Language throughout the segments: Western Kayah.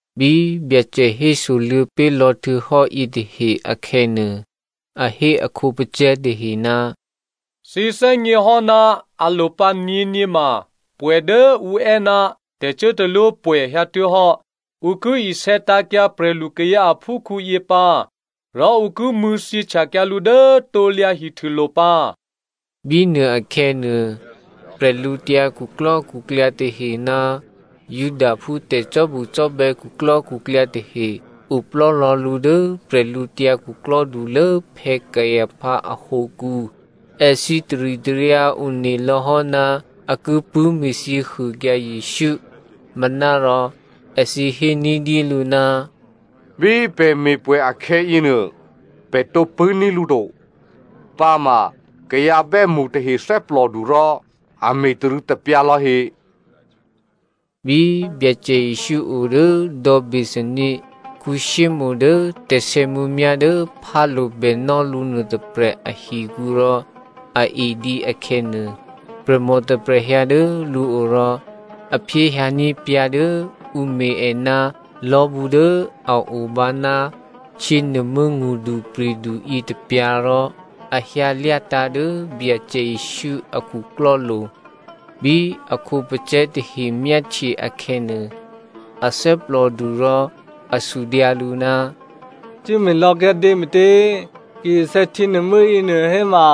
Bí Byacè hésoluô̌ pé̤ lò̌ htuô̌hò́ yětahe akhè̌nuô, a hé a khǒpacè̤̌ tahe, “Thǐ thè́gněhò́, alopǎ nyě̤nyě ma pwè̌ dố ǔ è́ ná tè̤cuốtalwópwè̌ hyǎtuố̤hò́. Ǔ ki isè̌tǎ̤kyǎ prè̤lukayǎ aphúkhǔyě pǎ rò ǔ ki mṳ̂̌thyěhtyakyǎ lǔ dố krusulo̤ pǎ.” Bínuôakhè̌nuô, bwídukhu tahe ná Judaphú tè̤cò́bucò́bè̌ khuklò́khuklyǎ tahe oplò́lò̌ lǔ dố bwídukhulố Caipha ahǒkǔ. Èthǐ taritaryǎ one lò̌ hò́ ná a ki pṳ̂́me̤thyě huôkyǎ Jesǔ. Manárò èthǐ hé ní̤dyélǔ, “Bí pè̤ me̤pwè̌ akhè̌yěnuô pè̤ tǒ pṳ̂́ní̤ lǔ to, pǎma kayǎ bè́mṳ tahe thè́plòdu rò a me̤tarû̌tapyǎ lò̌he.” Bí Byacè Jesǔ o dố dò̌ Bethania Simonè dố tè̤sè̌mǔmyá̤ dố phálo̤ bènò́ lǔ nuôtôprè̤ ahikǔ rò a edǐ akhè̌nuô, prè̤mò tôprè̤ hyǎ dố lǔo rò a phyéhyǎní̤ pyǎ̤ dố ǔ me̤ è ná lò̤́bǔ dố a obǎ ná htyěnuô̤mû́ ngṳdupri̤du yětôpyǎ̤ rò a hyǎlyátǎ̤ dố Byacè Jesǔ a khuklò́lo̤. Bí a khǒpacè̤̌ tahe myáhtye akhè̌nuô, a thè́plòdu rò a sudyǎ lǔ, “Cuốme̤lò̌ kyǎdě me̤tě? Ki isè̌ htyěnuô̤mû́ yěnuô héma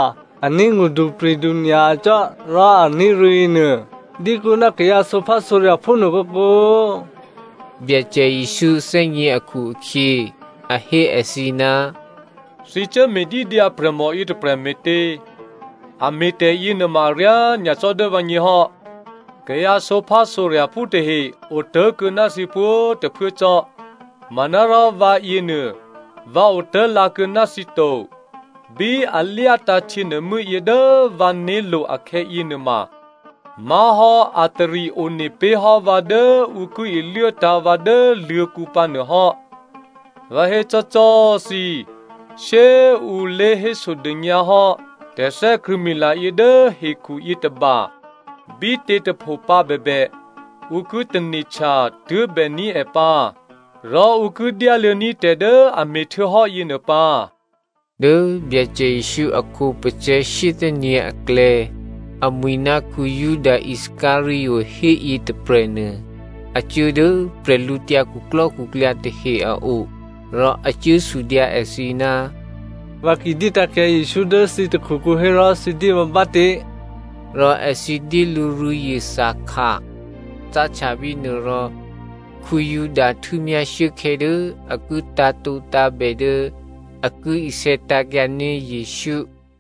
a ní̤ ngṳdupri̤du nyacò́ rò a ní̤ rû̌ yěnuô dyékuô̌ ná kayǎ sǒphásǒrya̤phú nuô kǒkǒ.” Byacè Jesǔ thè́gně akhu-akhyě, a hé èthǐ, “Thǐ cuố me̤dídyǎ prè̤mò yětôprè̤ me̤tě? A me̤tè̤yě nuôma aryá nyacò́ dố vǎgně hò́. Kayǎ sǒphásǒrya̤phú tahe otố̤kuô̌ ná thǐ pwǒ̤꤮ tôphuố cò́, manárò vǎyěnuô vǎ otố̤lǎ kuô̌ ná thǐ to. Bí a lyátǎ̤ htyěnuô̤mû́ yě dố vǎ né̤lo̤ akhè̌ yěnuôma, má̤hò́ a tari one pé̤hò́ vǎ dố ǔ ki iluốtǎ̤ vǎ dố luô̤̌kǔ pǎ nuô hò́. Vǎ hécò́꤮ cò́ thǐ, shyé꤮ ǔ lě hésodônyǎ hò́ tè̤thè́krṳ̂̌mila yě dố hekhu yětôba bítě꤮ tôpho pǎ bèbè, ǔ ki tane̤htya tuố̤bèní̤ è pǎ rò ǔ ki dyáluô̌ní̤ tè̤ dố a me̤htuô̌hò́ yěnuô pǎ.” Dố Byacè Jesǔ a khǒpacè̤̌ shyéthè́nyě̤ aklè̌ amwi̤ ná Juda Iscariot héyětôprè̤nuô, a cuố dố bwídukhu tahe a o. Rò a cuố sudyǎ èthǐ, “Vǎ ki dyétǎ̤kyǎ Jesǔ dố thǐ takhukǔ hérò thǐ dyé vǎ bátě?” Rò èthǐ dyé lǔ rû̌zye thakha. Cáhtya bínuô rò Juda htû́myá shuốkhè̌ dố a ki tǎ̤tǒtǎ̤bè dố a ki isè̌tǎ̤kyǎní̤ Jesǔ.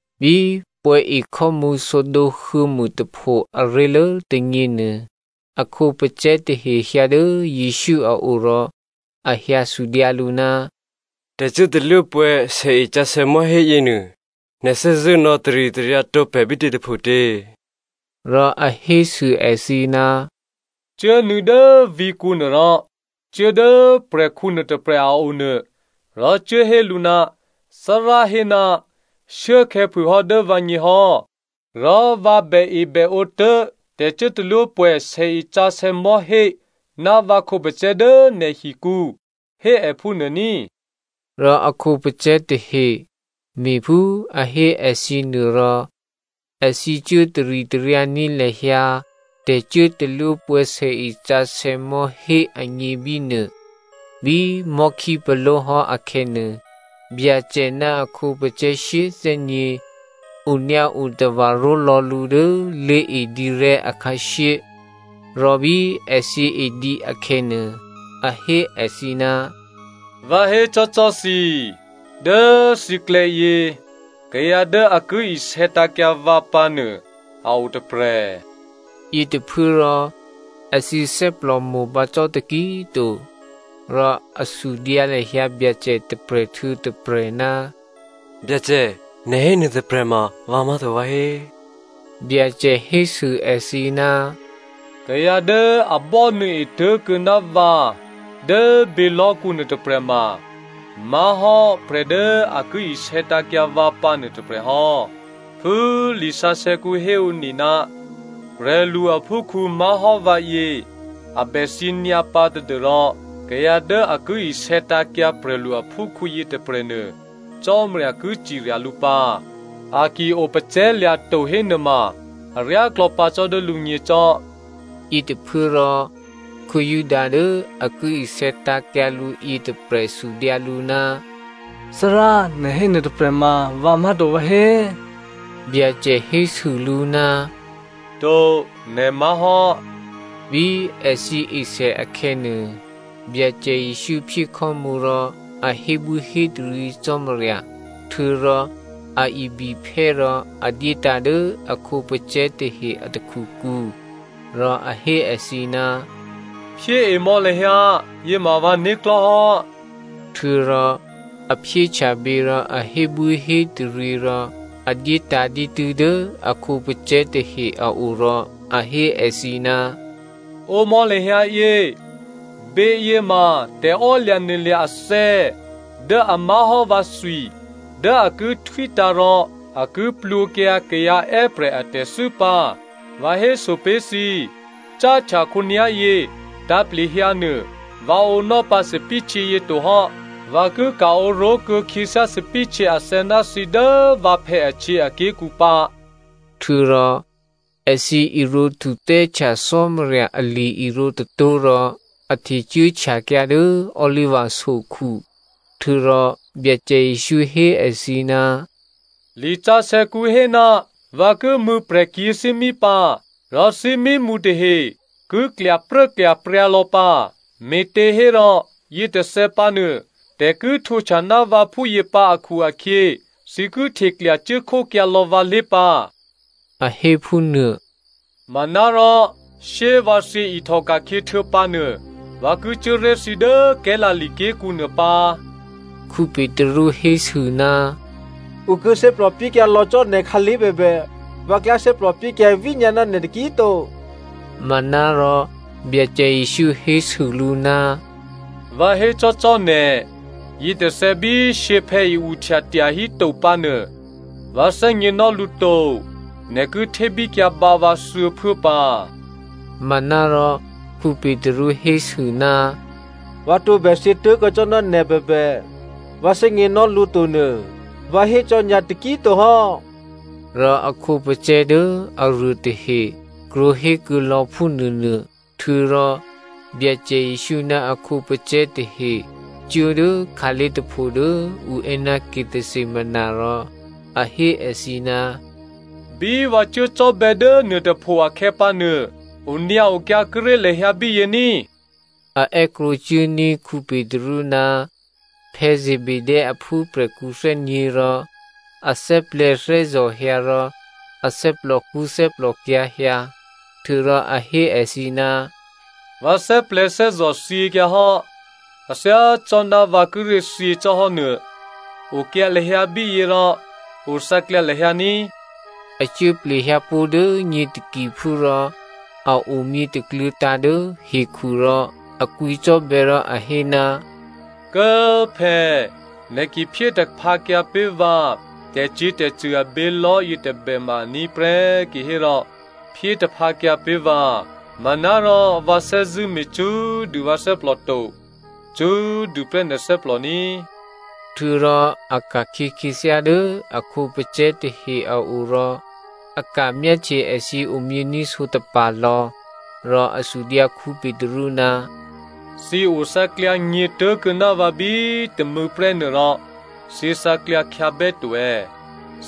Bí pwè̌ e khò́mǔ sǒdǒ huô̌mûtapho aré̤lố tônyě nuô, a khǒpacè̤̌ tahe hyǎ dố Jesǔ a o rò a hyǎsudyǎ lǔ, “Tè̤cuốtalwópwè̌ sèesǎsè̌ mò̤́hé yěnuô, nè̤ thè́zṳ̂́ nò̌taritaryǎ tǒ pè̤ bítě tôphotě?” Rò a hésû èthǐ, “Cuốnuô̌ dố vǐ̤kǔ nuôrò cuố dố prè̤khǔ nuôtôprè̤ a o nuô rò cuố hé lǔ, ‘Thárá hé, shuốkhè̌ phûhò́ dố vǎgně hò́, rò vǎ bèebèǒ tố̤ tè̤cuốtalwópwè̌ sèesǎsè̌ mò̤́hé ná vǎ khǒpacè̤̌ dố nè̤hikǔ’ hé è phúnuô ní꤮.” Rò a khǒpacè̤̌ tahe me̤phú a hé èthǐ nuô rò èthǐ cuố taritaryǎní̤ lahyǎ tè̤cuốtalwópwè̌ sèesǎsè̌ mò̤́hé agně bínuô. Bí mò̤́khípaló̤hò́ akhè̌nuô, Byacè ná a khǒpacè̤̌ shyéthè́nyě̤ onyǎo tava̤ ró̤lò̌ lǔ dố lé̤edǐrè̤́ akhǎshyé. Rò bí èthǐ edǐ akhè̌nuô, a hé èthǐ, “Vǎ hécò́cò́꤮ thǐ, dố thǐklè̌ yě, kayǎ dố a ki isè̌tǎ̤kyǎ vǎ pǎnuô a o tôprè̤.” Yětôphuốrò èthǐ thè́plò mo̤pǎ cò́ taki꤮ to, rò a sudyǎ lahyǎ Byacè tôprè̤ htuô̌ tôprè̤, “Byacè, nè̤ hénuô tôprè̤ma vǎ má̤to vǎhé?” Byacè hésû èthǐ, “Kayǎ dố a bò́nuô̌e tố̤kuô̌ ná vǎ dố bělò̤́kǔ nuôtôprè̤ ma má̤hò́ prè̤ dố a ki isè̌tǎ̤kyǎ vǎ pǎ nuôtôprè̤ hò́. Phú lisǎsè̌kǔ héone ná prè̤lu aphúkhǔ má̤hò́ vǎyě a bè thyě nyǎpǎ tadû́rò kayǎ dố a ki isè̌tǎ̤kyǎ prè̤lu aphúkhǔ yětôprè̤nuô, Cò́marya ki cirya lǔ pǎ. A ki opacè̤̌lya̤ to hénuôma aryáklò̌ pǎ cò́ dố lǔgně cò́.” Yětôphuốrò Juda dố a ki isè̌tǎ̤kyǎ lǔ yětôprè̤ sudyǎ lǔ, “Thárá, nè̤ hé nuôtôprè̤ma vǎ má̤to, vǎhé?” Byacè hésû lǔ, “To, nè̤ má̤hò́.” Bí èthǐ esè akhè̌nuô, Byacè Jesǔ phyé khò́mǔ rò a hébwíhétaryě Cò́marya, htuô̌rò a ibiphè́ rò a dyétǎ̤ dố a khǒpacè̤̌ tahe a takhukǔ, rò a hé èthǐ, “Phyéemò̌ lahyǎ, yěma vǎ né̤klò̤́ hò́.” Htuô̌rò a phyéhtya bě rò a hébwíhétaryě rò a dyétǎ̤ dǐtû́ dố a khǒpacè̤̌ tahe a o rò a hé èthǐ, “Ǒmò̌ lahyǎ yě. Běyě ma tè̤emaklò̤ athè̌ dố a má̤hò́ vǎthwi dố a ki htwítǎ̤ rò a ki plwǒkyǎ kayǎ è́prè̤ atè̤thû́ pǎ. Vǎ héso pé̤ thǐ, cáhtya khǒnyá̤yě tǎ̤plehyǎnuô vǎ ǒnò́ pǎ thòbǐthèhtyě yě tohò́. Vǎ ki ka̤ǒ ró̤kuô̌ khyěthyá thòbǐthèhtyě athè̌ ná thǐ dố vǎphè̌ ahtyěaké̤kǔ pǎ.” Htuô̌rò èthǐ irǒ htuthè́htya Cò́marya ali-irǒ tôtó̤ rò a htecuốhtyakyǎ dố Oliva sokhu. Htuô̌rò Byacè Jesǔ hé èthǐ, “Lisǎsè̌kǔ hé, ‘Vǎ ki mṳ̂̌ prè̤kyě̤thímí pǎ, rò thímímṳ tahe ki klyapruốklyapryǎ lò̌ pǎ.’ “Me̤těhérò yětôthè̌ pǎ nuô, tè̤ ki htwǒhtya ná vǎ phúyě pǎ akhu-akhyě, thǐ ki hteklya cuốkhókyǎlò̌ vǎlé̤ pǎ,” a hé phúnuô. “Manárò shyé꤮ vǎ thyě ihtòka̤khyě htuô̌pǎnuô, vǎ ki cuố ré̤ thǐ dố Galilea ké̤kǔ nuô pǎ.” Petru hésû, “Ǔ ki thè́plòpyékyǎ lò̌ cò́ nè̤ khǎlé̤ bèbè, vǎ klyá thè́plò pyékyǎ vínyǎ ná nè̤ taki꤮ to.” Manárò Byacè Jesǔ hésû lǔ, “Vǎ hécò́cò́ nè̤, yětôthè̌ bí shyěphè̌ i-uhtya tyahíto pǎ nuô, vǎ thè́gněnò́ lǔ to, nè̤ ki htébíkyǎ bǎ vǎ thuô̌phuố pǎ.” Manárò Petru hésû, “Vǎ tǒbè thyě tố̤kuô̌ cò́ ná nè̤ bèbè, vǎ thè́gněnò́ lǔ to nuô vǎ hécò́ nyǎ taki꤮ to hò́.” Rò a khǒpacè̤̌ dố aruô tahe krwǒhékuô̌ lò̌ phúnuônuô. Htuô̌rò Byacè Jesǔ ná a khǒpacè̤̌ tahe cuố dố khǎlé̤ tôpho dố ǔ è́ ná Gethsemani rò a hé èthǐ, “Bí vǎ cuố cò́bè̌ dố nuôtôpho akhè̌pǎnuô, onyǎokyǎ kuốré̤ lahyǎ bíyě ní꤮.” A è́krwǒcuốní̤ Petru ná Zebedeo aphúprè̤khǔ thè́nyě̤ rò a thè́plè̤̌thè́zò̤ hyǎ rò a thè́plòkṳ́ thè́plòkyǎ̤ hyǎ. Htuô̌rò a hé èthǐ, “Vǎ thè́plè̤̌thè́zò̤ thyěkyǎhò́, a thyácò́ná vǎ kíré̤ thyě cò́hò́nuô. Okyǎ lahyǎ bíyě rò othǎklyǎ lahyǎ ní꤮.” A cuố plehyǎpó̤ dố nyě takiphú rò a omyě takluô̤̌tǎ̤ dố hekhu rò a kwǐcò́bè̌ rò a hé, “Kố꤮ phè̌꤮ nè̤ ki phyé taphǎkyǎ pé̤ vǎ tè̤cyě̤tè̤cṳ̂ abělò̤́ yětôbè ma aní̤ prè́ kihérò phyétaphǎkyǎ pé̤ vǎ, manárò vǎ thè́zṳ̂́ me̤ cṳ́꤮ dû vǎ thè́plò to. Cṳ́꤮ dûprè́ nè̤ thè́plò ní꤮.” Htuô̌rò a ka̤khyě khyěthyá dố a khǒpacè̤̌ tahe a o rò a ka̤ myáhtye èthǐ omyění̤ sǒtapa̤ lò̌, rò a sudyǎ Petru, “Thǐ othǎklyǎ nyě̤ tố̤kuô̌ ná vǎ bí tômû̌nuôprè́ rò thǐ thǎklyǎ khyǎbè́to è̌?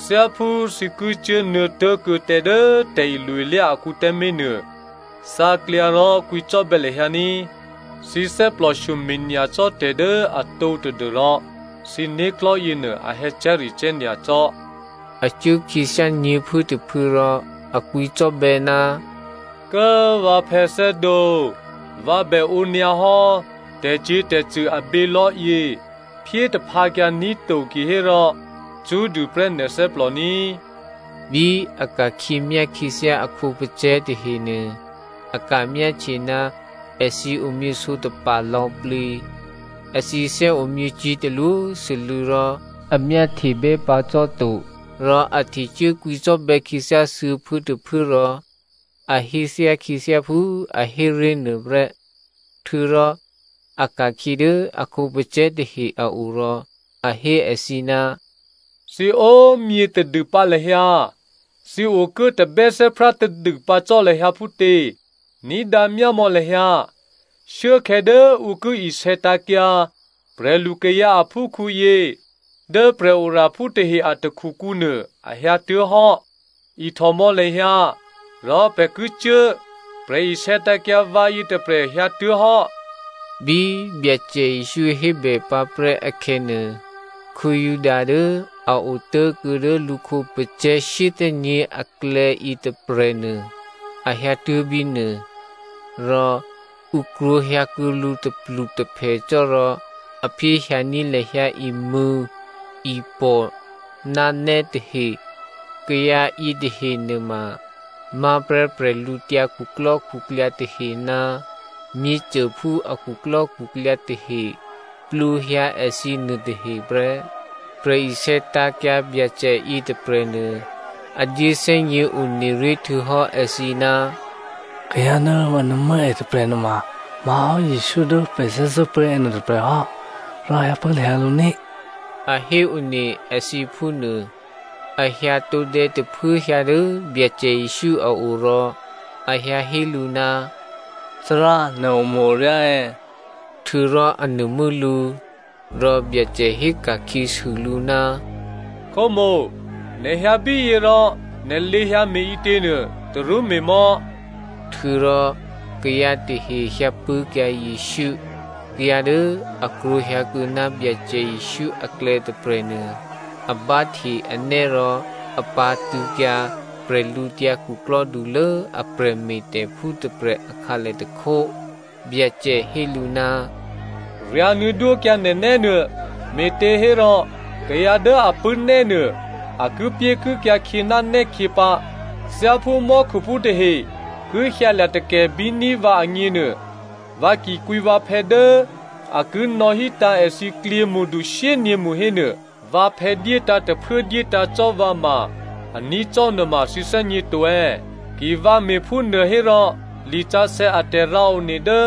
Thyáphú thǐ ki cuốnuô̌ tố̤kuô̌ tǎ dố tè̤ilo-ilyá akǔ tǎmé̤nuô, thǎklyǎ rò kwǐcò́bè̌ lahyǎ ní꤮. Thǐ thè́plòshyome̤ nyacò́ tè̤ dố atǒ tadû́rò thǐ né̤klò̤́ yěnuô a hè̌cè̤́recè̤́ nyacò́.” A cuố khyěthyá nyě̤phuốtôphuố rò a kwǐcò́bè̌, “Kố꤮ vǎ phè̌thè́dǒ꤮, vǎ bè ǒ꤮ nyǎ hò́ tè̤cyě̤tè̤cṳ̂ a bělò̤́yě, phyétaphǎkyǎ ní̤ to kihérò, cṳ́꤮ dûprè́ nè̤ thè́plòní꤮.” Bí a ka̤khyě myá khyěthyá a khǒpacè̤̌ tahenuô, a ka̤myáhtye ná èthǐ omyěsǒtapa̤ lò̌plǐ. Èthǐ thè́omyě cyě̤talwósû́lû̌ rò a myáhtebè́ pǎ cò́ to. Rò a htecuố kwǐcò́bè̌ khyěthyá thuô̌phuốtôphuố rò a héthyá khyěthyá phú a hé ré̤ nuôprè́. Htuô̌rò a ka̤khyě dố a khǒpacè̤̌ tahe a o rò a hé èthǐ, “Thǐ o꤮ myě tadûpǎ lahyǎ, thǐ okuố tabè́thè́prá tadû pǎ cò́ lahyǎ phútě? Ní̤dǎ myámò̌ lahyǎ, shuốkhè̌ dố ǔ ki isè̌tǎ̤kyǎ prè̤lukayǎ aphúkhǔyě dố prè̤oraphú tahe a takhukǔnuô, a hyǎtuố̤hò́. Ihtòmò̌ lahyǎ, rò pè̤ ki cuố꤮, prè̤ isè̌tǎ̤kyǎ vǎ yětôprè̤ hyǎtuố̤hò́.” Bí Byacè Jesǔ hébè pǎprè́ akhè̌nuô, Juda dố a otố̤kuô̌ dố lǔ khǒpacè̤̌ shyéthè́nyě̤ aklè̌ yětôprè̤nuô a hyǎtuố̤ bínuô. Rò ǔ krwǒhyǎkuô̌ lǔ tôplutôphè cò́ rò a phyéhyǎní̤ lahyǎ imṳ̂̌, ipò̤ ná nè́ tahe. Kayǎ yětahe nuôma má̤prè́ bwídukhu tahe ná myěcôphú a khuklò́khuklyǎ tahe plwǒhyǎ èthǐ nuôtahe prè́. Prè̤isè̌tǎ̤kyǎ Byacè yětôprè̤nuô a dyéthè́gně one ré̤ htuô̌hò́ èthǐ, “Kayǎ dố vǎ nuô̤mû́ è tôprè̤ nuôma má̤hò́ Jesǔ dố pè̤ thè́zṳ̂́pṳ̂́ è nuôtôprè̤ hò́ rò hyǎpṳ̂́ lahyǎ lǔ ní,” a héone èthǐ phúnuô. A hyǎ tǒdè̌ tôphuốhyǎ dố Byacè Jesǔ a o rò a hyǎ hé lǔ, “Thárá, nè̤ omo̤-oryá è̌?” Htuô̌rò a nuô̤mû́ lǔ. Rò Byacè héka̤khyěsû lǔ, “Khǒmo̤, nè̤ hyǎ bíyě rò nè̤ lé̤hyǎ me̤ǐtěnuô tarú me̤mò̌.” Htuô̌rò kayǎ tahe hyǎpṳ̂́kyǎ Jesǔ. Kayǎ dố a krwǒ hyǎkuô̌ ná Byacè Jesǔ aklè̌ tôprè̤nuô a báhte anè́ rò a pǎ̤tṳ̂̌kyǎ bwídukhulố a prè̤me̤tè̤phú tôprè̤ akhǎlè tôkhó. Byacè hé lǔ, “Ryǎ̤nuô̌ dwókyǎ nè̤nè́ nuô. Me̤těhérò kayǎ dố a pṳ̂́ nè́nuô a kipyékikyǎ khyě ná nè́khyě pǎ. Thyáphú mò́khuphú tahe ki hyǎlya̤ takè̤bíní̤ vǎ agněnuô, vǎ ki kwǐ vǎphè̌ dố a ki nò̌hítǎ̤ èthǐ klyěmṳdu shyényě̤mṳ hénuô vǎphè̌ dyétǎ̤ tôphuố dyétǎ̤ cò́ vǎ ma꤮ a ní̤ cò́ nuôma thǐ thè́gněto è̌? Ki vǎ me̤phúnuô hérò lisǎsè̌ a tè̤rǎone dố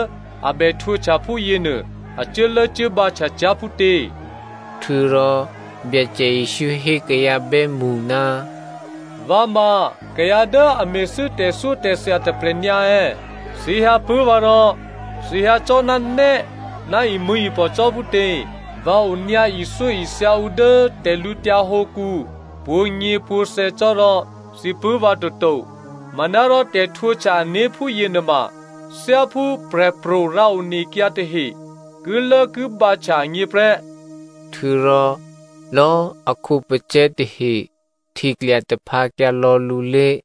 a bè htwǒhtya phúyěnuô a cuốlốcuốbǎhtya cyá̤ phútě?” Htuô̌rò Byacè Jesǔ hé kayǎ bè́mṳ, “Vǎ ma kayǎ dố a me̤thû́ tè̤thyótè̤thya tôprè̤ nyǎ è̌? Thǐ hyǎpṳ̂́ vǎ rò thǐ hyǎ cò́ ná nè́ ná imṳ̂̌ipò̤ cò́ phútě? Vǎ onyǎ ithyóithya ǔ dố tè̤lǔtyǎ hǒkǔ pwǒ̤nyěpwǒ̤thè̌ cò́ rò thǐ pṳ̂́ vǎ toto. Manárò tè̤htwǒhtya ané̤ phúyě nuôma thyáphú prè̤pro̤ rǎonekyǎ tahe kilốkibǎhtya agně prè́.” Htuô̌rò lò̌꤮ a khǒpacè̤̌ tahe hteklya taphǎkyǎ lò̌ lǔlé̤.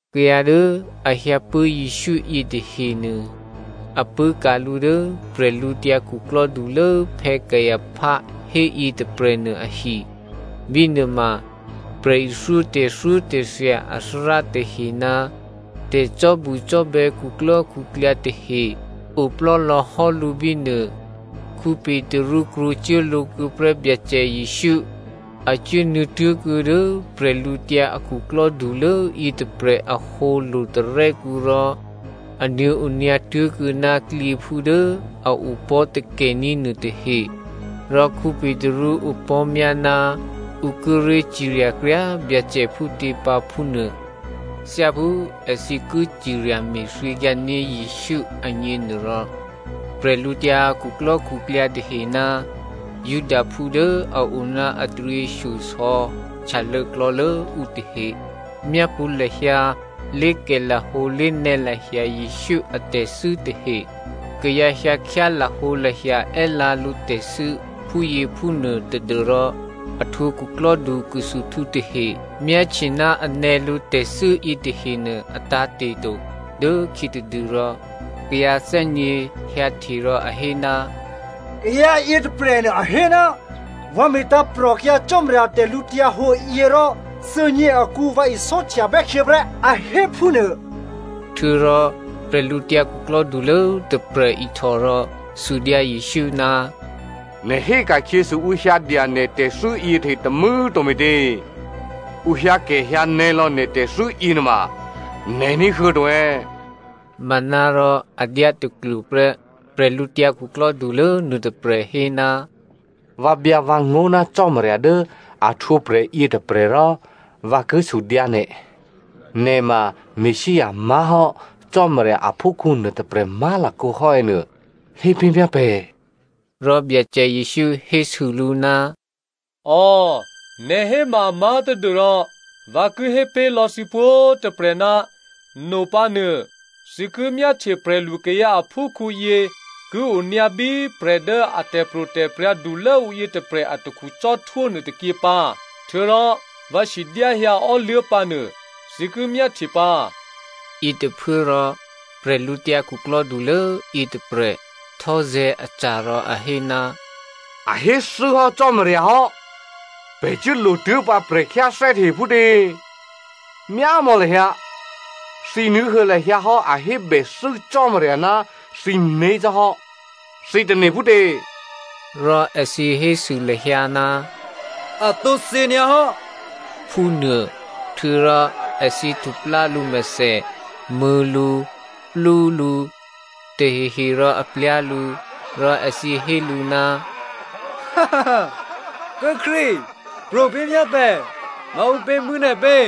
Kayǎ dố a hyǎpṳ̂́ Jesǔ yětahenuô, a pṳ̂́ka̤ lǔ dố bwídukhulố Caipha héyě tôprè̤nuô ahi. Bínuô ma prè̤ithyó tè̤thyótè̤thya athárá tahe ná tè̤cò́bucò́bè̌ khuklò́khuklyǎ tahe oplò́ lò̌hò́ lǔ bínuô. Petru krwǒcuố lǒ kuô̌ prè́ Byacè Jesǔ. A cuố nuô̌tuố̤kuô̌ dố prè̤lǔtyǎ akhuklò́ dulố yětôprè̤ ahǒ lo̤tarè́kǔ rò a nuô̌ onyǎ tố̤kuô̌ ná klyěphú dố a opò̤́ takè̤ní̤ nuôtahe. Rò Petru opò̤́myá ná ǔ kíré̤ cirya kryá꤮ Byacè phútě pǎ, phúnuô. Thyáphú èthǐ ki cirya me̤thyěkyǎ ní̤ Jesǔ agněnuôrò, bwídukhu tahe ná Judaphú dố a o ná a taryěshyosò̌ htyalô̌ klò̌lố ǔ tahe myápṳ̌ lahyǎ lé̤kè̤lahǒ lé̤nè̌lahya Jesǔ atè̤thû́ tahe. Kayǎ hyǎkhyá lahǒlahya è́lǎ lǔtè̤thû́ phúyěphúnuô tadû́rò a htwǒ khuklò́du khusuhtǔ tahe myáhtye ná a nè̌ lǔ tè̤thû́ yětahenuô a tǎ̤te̤ to. Dố khyětadûrò kayǎ thè́nyě̤ hyǎhte rò a hé, “Kayǎ yětôprè̤nuô a hé, ‘Vǎ me̤tǎ̤prò̤kyǎ Cò́marya tè̤lǔhǒduyě rò thuô̌nyě akǔ vǎ isò́htyabè́ khyěprè́’ a hé phúnuô.” Htuô̌rò bwídukhulố tôprè̤ ihtò rò sudyǎ Jesǔ, “Nè̤ hé ka̤khyěsû ǔ hyǎdya nè̤ tè̤thû́ yětahe tômû̌꤮ to me̤tě? Ǔ hyǎkè̤hyǎnè̌lò̌ nè̤ tè̤thû́ yěnuôma nè̤ ní̤huô̌ to è̌?” Manárò a dyátaklwo prè́. Bwídukhulố nuôtôprè̤ hé, “Vǎ byǎ vǎngó̤ ná Cò́marya dố a htwǒprè̤ yětôprè̤ rò vǎ ki sudyǎ nè̤, nè̤ ma Messia má̤hò́ Cò́marya aphúkhǔ nuôtôprè̤ má̤lakǒ hò́ è̌ nuô hépé̤myá pè̤.” Rò Byacè Jesǔ hésû lǔ, “Ò, nè̤ hénuôma amá̤ tadû́rò vǎ ki hépé̤ lò̌ thǐ pwǒ̤꤮ tôprè̤ ná nopǎnuô thǐ ki myáhtye prè̤lukayǎ aphúkhǔyě ki onyǎ bí prè̤ dố a tè̤pro̤tè̤prya̤ dulốǔ yětôprè̤ atakhu cò́htwó nuôtôkyě pǎ. Htuô̌rò vǎ sidyáhyǎ ò́luố̤ pǎ nuô thǐ ki myáhtye pǎ.” Yětôphuốrò bwídukhulố yětôprè̤ htò́zè̤̌ aca̤ rò a hé, “A héthû́hò́ Cò́marya hò́. Pè̤ cuốlotuố̤pǎ prè̤khyáthè́ tahe phútě? Myámò̌ lahyǎ, thǐ ní̤huô̌ lahyǎ hò́ a hébèthû́ Cò́marya ná thǐné̤ cò́ hò́. Thǐ tane̤ phútě?” Rò èthǐ hésû lahyǎ, “A tǒ thyě nyǎhò́,” phúnuô. Htuô̌rò èthǐ htuplá lǔmèthè, mṳ̂̌ lǔ, plú lǔ, tahehe rò a plyá̤ lǔ. Rò èthǐ hé lǔ, “Kố꤮ Krístu, pro̤ pé̤ myá pè̤, maǔpě mṳ̂̌ nè̤pě?”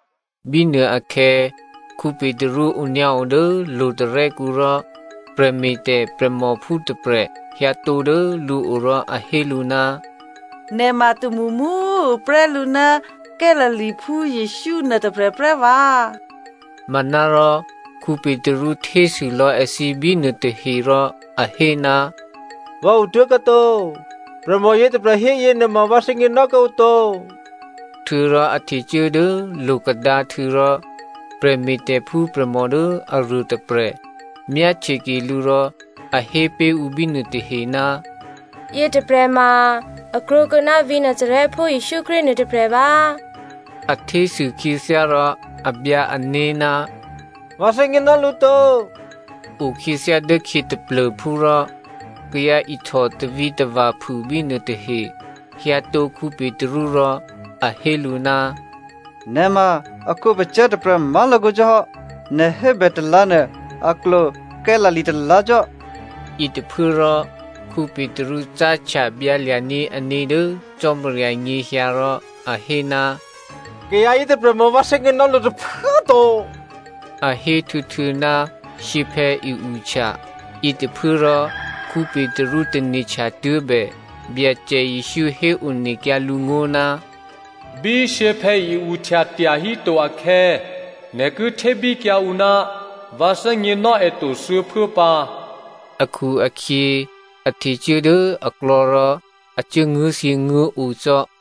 Bínuôakhè̌ Petru onyǎo dố lo̤tarè́kǔ rò prè̤me̤tè̤ prè̤mòphú tôprè̤ hyǎtǒ dố lǔo rò a hé lǔ, “Nè̤ ma tômṳmṳ꤮ tuô̌prè́ lǔ ná Galileaphú Jesǔ nuôtôprè̤ prè́ vǎ.” Manárò Petru htésû lò̌ èthǐ bínuô tahe rò a hé, “Vǎ otố̤kuô̌ to. Prè̤mò yětôprè̤ hé yěnuôma vǎ thè́gněnò́ kuô̌ǔ to.” Htuô̌rò a htecuố dố lo̤kadǎhtû̌ rò prè̤me̤tè̤phú prè̤mò dố aruôtôprè̤ myáhtyeke lǔ rò a hé pé̤ ǔ bínuô tahe, “Yětôprè̤ ma a krwǒkuô̌ ná vǐ̤ Nazarèphú Jesǔ Krístu nuô tôprè̤ vǎ꤮” A htésû khyěthyá rò a byǎ ané̤, “Vǎ thè́gněnò́ lǔ to.” Okhyěthyá dốkhyě taplô̤phú rò kayǎ ihtò tavǐtava̤ phû bínuô tahe hyǎtǒ Petru rò a hé lǔ, “Nè̤ ma èkhǒpacè̤̌ tôprè̤ má̤lakǒ cò́ hò́, nè̤ hébè talǎ̤ nuô a klwo Galilea talǎ̤ cò́.” Yětôphuốrò Petru cáhtya byǎlya̤ní̤ ané̤ dố Cò́marya nyěhyǎ rò a hé, “Kayǎ yětôprè̤ ma vǎ thè́gněnò́ lǔ tôphuố꤮ to,” A héhtuô̌htuô̌ ná shyěphè̌ i-uhtya. Yětôphuốrò Petru tane̤htya tuố̤bè Byacè Jesǔ héonekyǎ lǔ ngó̤, “Bí shyěphè̌ i-uhtya tyahíto akhè̌, nè̤ ki htébíkyǎ ǔ ná vǎ thè́gněnò́ è to thuô̌phuố pǎ,” akhu-akhyě a htecuố dố aklò̌ rò a cuố nguố̤thyěnguố̤o cò́.